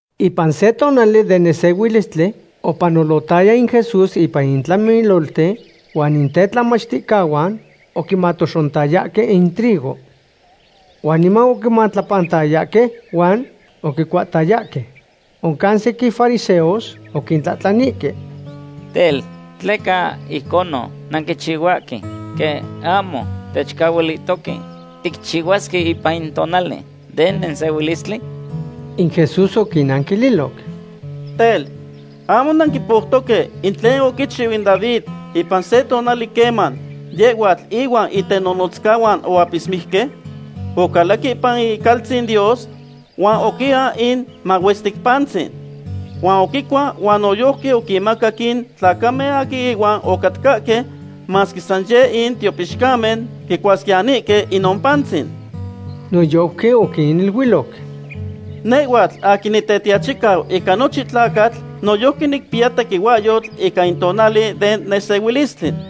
Ipan se tonali den nesehuilistli opanolotaya in Jesús ipan in tlamilolten, huan in tetlamachticahuan oquimatoxontayahque in trigo. Huan niman oquimatlapantayahque huan oquicuahtayahque. Oncan sequin fariseos oquintlahtlanihque: ―Tel, ¿tleca ijconon nanquichihuahque quen ahmo techcahualihtohque ticchihuasque ipan in tonali den nesehuilistli? In Jesús oquinnanquililoc: ―Tel, ¿ahmo nanquipoutoque in tlen oquichiu in David ipan se tonali queman yehhuatl ihuan itenonotzcahuan oapismijque? Ocalac ipan icaltzin Dios huan oquian in mahuestic pantzin. Huan oquicua huan noyojqui oquinmacac in tlacamen aquin ihuan ocatcahque, masque san yeh in tiopixcamen quicuasquiyanihque inon pantzin. Noyojqui oquiniluiloc: ―Nehhuatl aquin Nitetiachicau ica nochin tlacatl noyojqui nicpiya tequihuahyotl ica in tonali den nesehuilistli.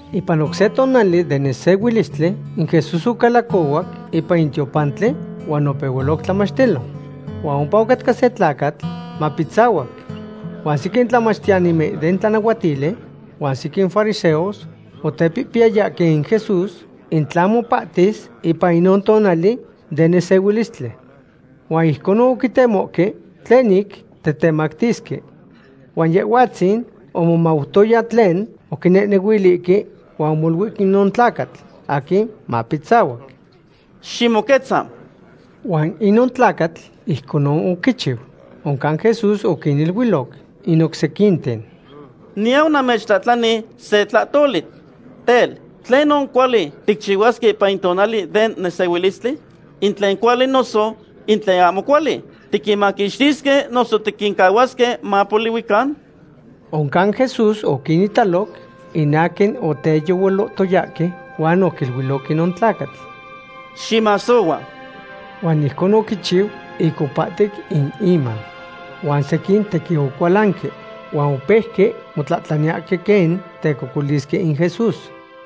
Ipan oc se tonali den nesehuilistli in Jesús ocalacohuac ipan in tiopantli huan opehualoc tlamachtilo. Huan ompa ocatca se tlacatl mapitzahuac. Huan sequin tlamachtiyanimen den tlanahuatili huan sequin fariseos otepihpiyayayahque in Jesús in tla mopahtis ipan inon tonali den nesehuilistli. Huan ijconon oquitemohque tlen ic tetemactisque. Huan Yehhuatzin omomautoya tlen oquinehnehuilihque, huan omoluic inon tlacatl aquin mapitzahuac: ―¡Ximoquetza! Huan inon tlacatl ijconon oquichiu. Oncan Jesús oquiniluiloc in oc sequinten: ―Niyau namechtlahtlani se tlahtoli. Tel, ¿tlenon cuali ticchihuasque ipan in tonali den nesehuilistli? ¿In tlen cuali noso in tlen ahmo cuali? ¿Tiquinmaquixtisque noso tiquincahuasque mapolihuican? Oncan Jesús oquinitaloc in aquin oteyehualohtoyahque, huan oquiluiloc inon tlacatl: ―Ximasohua. Huan ijcon oquichiu ic opahtic in iman. Huan sequin tequin ocualanque, huan opeuque motlahtlaniyahque quen tecocolisque in Jesús.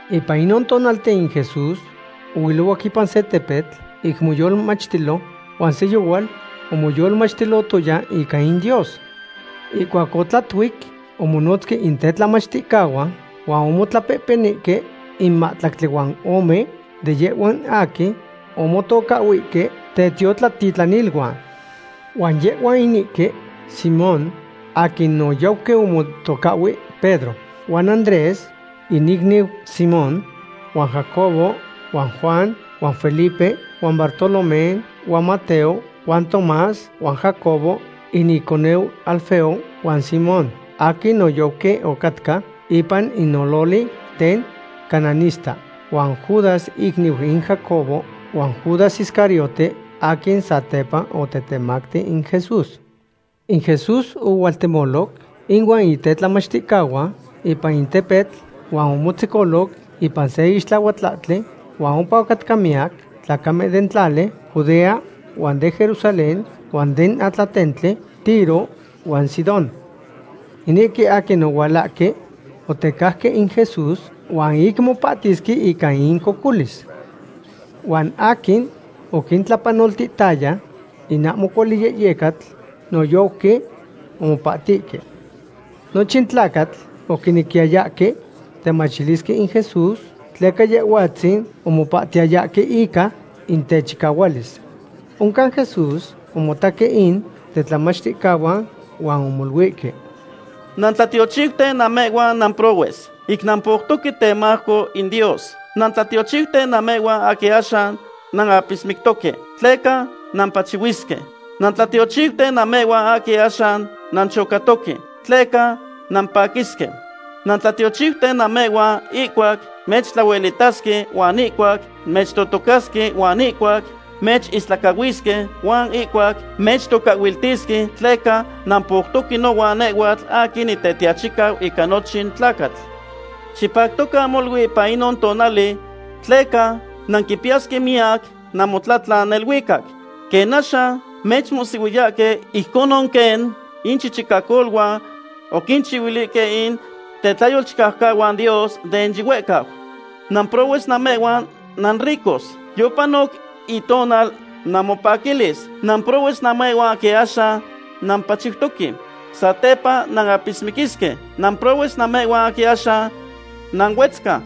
Ipan inon tonalten in Jesús ohuilohuac ipan se tepetl ic moyolmachtilo, huan se yohual omoyolmachtilotoya ica in Dios. Ihcuac otlatuic omonotzque in tetlamachticahuan huan omotlapehpenihque in mahtlactli huan ome de yehhuan aquin omotocahhuihque tetiotlatitlaniluan. Huan yehhuan inihque; Simón, aquin noyojqui omotocahhui Pedro, huan Andrés in icniu Simón huan Jacobo huan Juan huan Felipe huan Bartolomé huan Mateo huan Tomás huan Jacobo in iconeu Alfeo huan Simón, aquin noyojqui ocatca ipan in ololi den cananista, huan Judas icniu in Jacobo huan Judas Iscariote, aquin satepa otetemacti in Jesús. In Jesús ohualtemoloc ihuan in tetlamachticahuan ipan in tepetl huan omotzecoloc ipan se ixtlahuatlahtli huan ompa ocatcahque miyac tlacamen den tlali Judea huan den Jerusalén huan den atlatentli Tiro huan Sidón. Inihque aquin ohualahque otecajque in Jesús huan ic mopahtisque ica incocolis. Huan aquin oquintlapanoltiyaya in ahmo cuali yehyecatl noyojqui omopahtihque. Nochin tlacatl oquinequiyayahque temachilisque in Jesús, tleca Yehhuatzin omopahtiyayahque ica in techicahualis. Oncan Jesús omotaque in tetlamachticahuan huan omoluihque: ―Nantlatiochiuten namehhuan namprohues, ic nampoutoque temajco in Dios. ’Nantlatiochiuten namehhuan aquin axan nanapismictoque, tleca nampachihuisque. ’Nantlatiochiuten namehhuan aquin axan nanchocatoque tleca nampaquisque. ’Nantlatiochiuten namehhuan ihcuac mechtlahuelitasque huan ihcuac mechtotocasque huan ihcuac mechistlacahuisque huan ihcuac mechtocahhuiltisque, tleca nampoutoque nohuan nehhuatl aquin Nitetiachicau ica nochin tlacatl. Xipactocan molui ipan inon tonali tleca nanquipiyasque miyac namotlatlan neluicac. Quen axan mechmohsihuiyahque, ijconon quen inchichicacoluan oquinchihuilihque in tetlayolchicaucahuan Dios den yihuehcau. ’Namprohues namehhuan nanricos. Yopanoc itonal namopaquilis. ’Namprohues namehhuan aquin axan nampachiutoque. Satepa nanapismiquisque. ’Namprohues namehhuan aquin axan nanuetzca.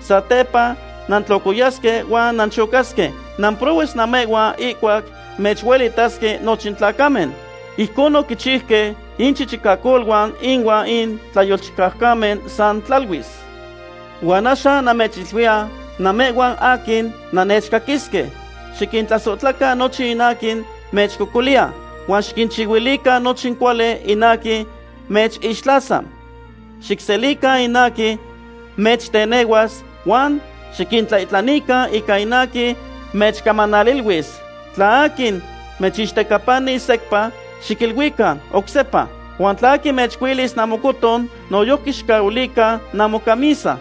Satepa nantlocoyasque huan nanchocasque. ’Namprohues namehhuan ihcuac mechuelitasque nochin tlacamen. Ijcon oquichiuque inchichicacoluan inuan in tlayolchicaucamen san tlaluis. ’Huan axan namechiluiya namehhuan aquin nannechcaquisque: Xiquintlasohtlacan nochin aquin mechcocoliya, huan xiquinchihuilican nochin cuali in aquin mechixtlasa. Xicselican in aquin mechtenehuas, huan xiquintlaihtlanican ica in aquin mechcamanaliluis. Tla aquin mechixtecapanis secpa, xiquiluican: Oc sepa. Huan tla aquin mechcuilis namocoton, noyojqui xicahuilican namocamisa.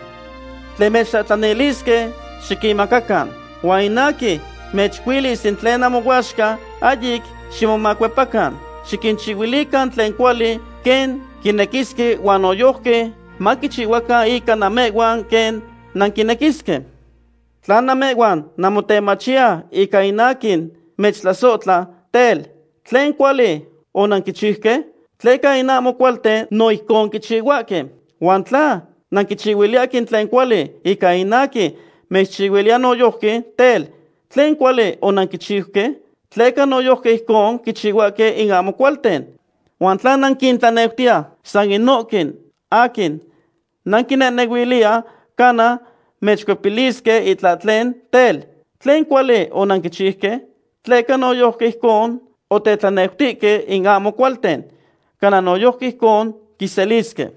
Tlen mechtlahtlanilisque, xiquinmacacan; huan in aquin mechcuilis in tlen namoyaxca, ahyic ximomacuepacan. Xiquinchihuilican tlen cuali quen quinequisque huan noyojqui maquichihuacan ica namehhuan quen nanquinequisque. ’Tla namehhuan nanmotemachiya ica in aquin mechtlasohtla, tel, ¿tlen cuali onanquichiuque?, tleca in ahmo cualten no ijcon quichihuahque. Huan tla nanquinchihuiliyahque in tlen cuali ica in aquin mechchihuiliya noyojqui, tel, ¿tlen cuali onanquichiuque?, tleca noyojqui ijcon quichihuahque in ahmo cualten. Huan tla nanquintlaneutiye san inohque aquin nanquinehnehuiliya cana mechcuepilisque itlahtlen, tel, ¿tlen cuali onanquichiuque? Tleca noyojqui ijcon otetlaneutihque in ahmo cualten, cana noyojqui ijcon quiselisque.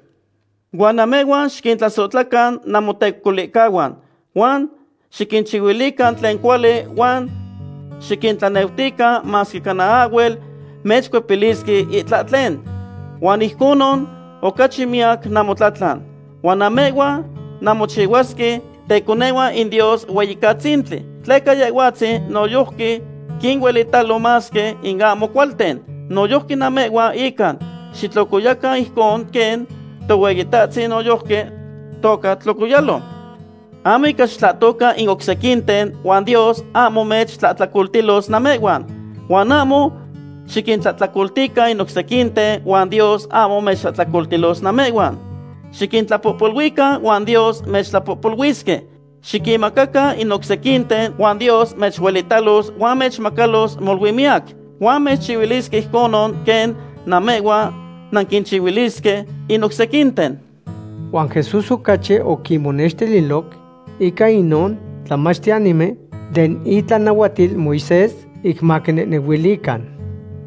Huan namehhuan xiquintlasohtlacan namotecocolihcahuan huan xiquinchihuilican tlen cuali huan xiquintlaneutican masque cana ahhuel mechcuepilisque itlahtlen. Huan ijconon ocachi miyac namotlatlan. Huan namehhuan nanmochihuasque teconehuan in Dios Hueyicatzintli, tleca Yehhuatzin noyojqui quinuelitalo masque in ahmo cualten. Noyojqui namehhuan inca xitlocoyacan ijcon quen Tohueyitahtzin noyojqui toca tlocoyalo. ’Ahmo ica xitlahtocan in oc sequinten huan Dios ahmo mechtlahtlacoltilos namehhuan. Huan ahmo xiquintlahtlacoltican in oc sequinten huan Dios ahmo mechtlahtlacoltilos namehhuan. Xiquintlapohpoluican huan Dios mechtlapohpoluisque. Xiquinmacacan in oc sequinten huan Dios mechuelitalos huan mechmacalos molui miyac. Huan mechchihuilisque ijconon quen namehhuan nanquinchihuilisque in oc sequinten. Huan Jesús ocachi oquinnextililoc ica inohque tlamachtiyanimen den itlanahuatil Moisés ic maquinehnehuilican: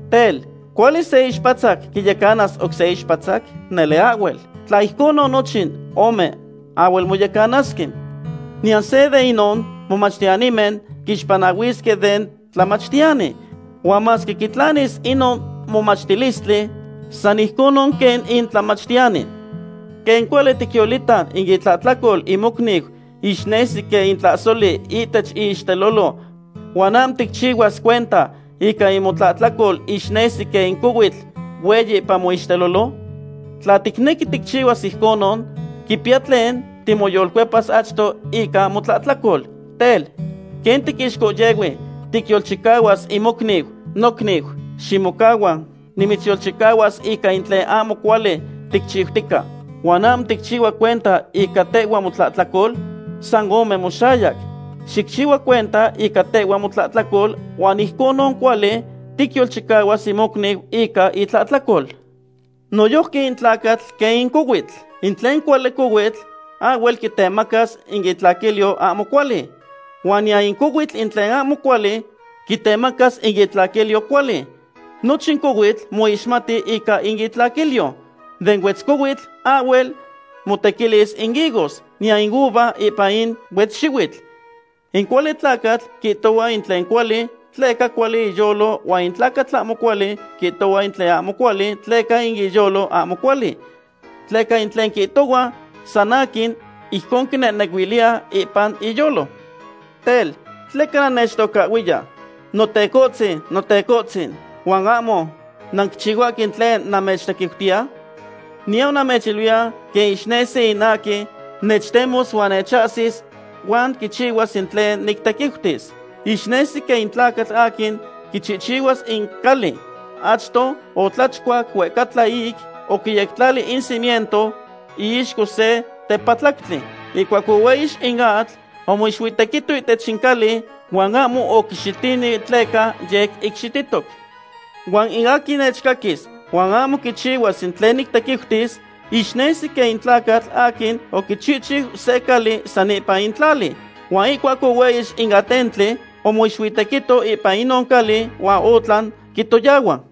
―Tel, ¿cuali se ixpatzac quiyecana oc se ixpatzac? Nele ahhuel. Tla ijconon nochin ome ahhuel moyecanasque. Niyan seya de inon momachtiyanimen quixpanahuisque den tlamachtiyani. Huan masque quitlanis inon momachtilistli, san ijconon quen in tlamachtiyani. ’¿Quen cuali ticyolita in itlahtlacol in mocniu ixnesi quen in tlahsoli ihtech iixtelolo huan ahmo ticchihuas cuenta ica in motlahtlacol ixnesi quen in cohuitl hueyi ipan moixtelolo? Tla ticnequi ticchihuas ijconon, quipiya tlen timoyolcuepas achto ica motlahtlacol. Tel, ¿quen tiixcohyehui ticyolchicahuas in mocniu: “Nocniu, ximocahua, nimitzyolchicahuas ica in tlen ahmo cuali ticchiutica”; huan ahmo ticchihua cuenta ica tehhua motlahtlacol? ¡San ome moxayac! Xicchihua cuenta ica tehhua motlahtlacol huan ijconon cuali ticyolchicahuas in mocniu ica itlahtlacol. ’Noyojqui in tlacatl quen in cohuitl. In tlen cuali cohuitl ahhuel quitemacas in itlaquilyo ahmo cuali. Huan niyan in cohuitl tlen ahmo cuali quitemacas in itlaquilyo cuali. Nochin cohuitl moixmati ica in itlaquilyo. Den huetzcohuitl ahhuel motequilis in higos, niyan in uva ipan in huetzxihuitl. In cuali tlacatl quihtohua in tlen cuali tleca cuali iyolo huan in tlacatl ahmo cuali quihtohua in tlen ahmo cuali tleca in iyolo ahmo cuali. Tleca in tlen quihtohua san aquin, ijcon quinehnehuiliya ipan iyolo. ’Tel, ¿tleca nannechtocahhuiya: “Notecohtzin, Notecohtzin”, huan ahmo nanquichihuahque in tlen namechtequiutiya? Niyau namechiluiya quen ixnesi in aquin nechtemos huan nechcaquis huan quichihuas in tlen nictequiutis. Ixnesi quen in tlacatl aquin quichihchihuas in cali. Achto otlachcuac huehcatla ic oquiyectlali in cimiento iixco se tepatlactli. Ihcuac ohueyix in atl, omoixuitequito ihtech in cali huan ahmo oquixitini tleca yec icxihtitoc. Huan in aquin nechcaquis huan ahmo quichihuas in tlen nictequiutis, ixnesi quen in tlacatl aquin oquichihchiu se cali san ipan in tlali. Huan ihcuac ohueyix in atentli, omoixuitequito ipan inon cali huan otlan quitoyahua.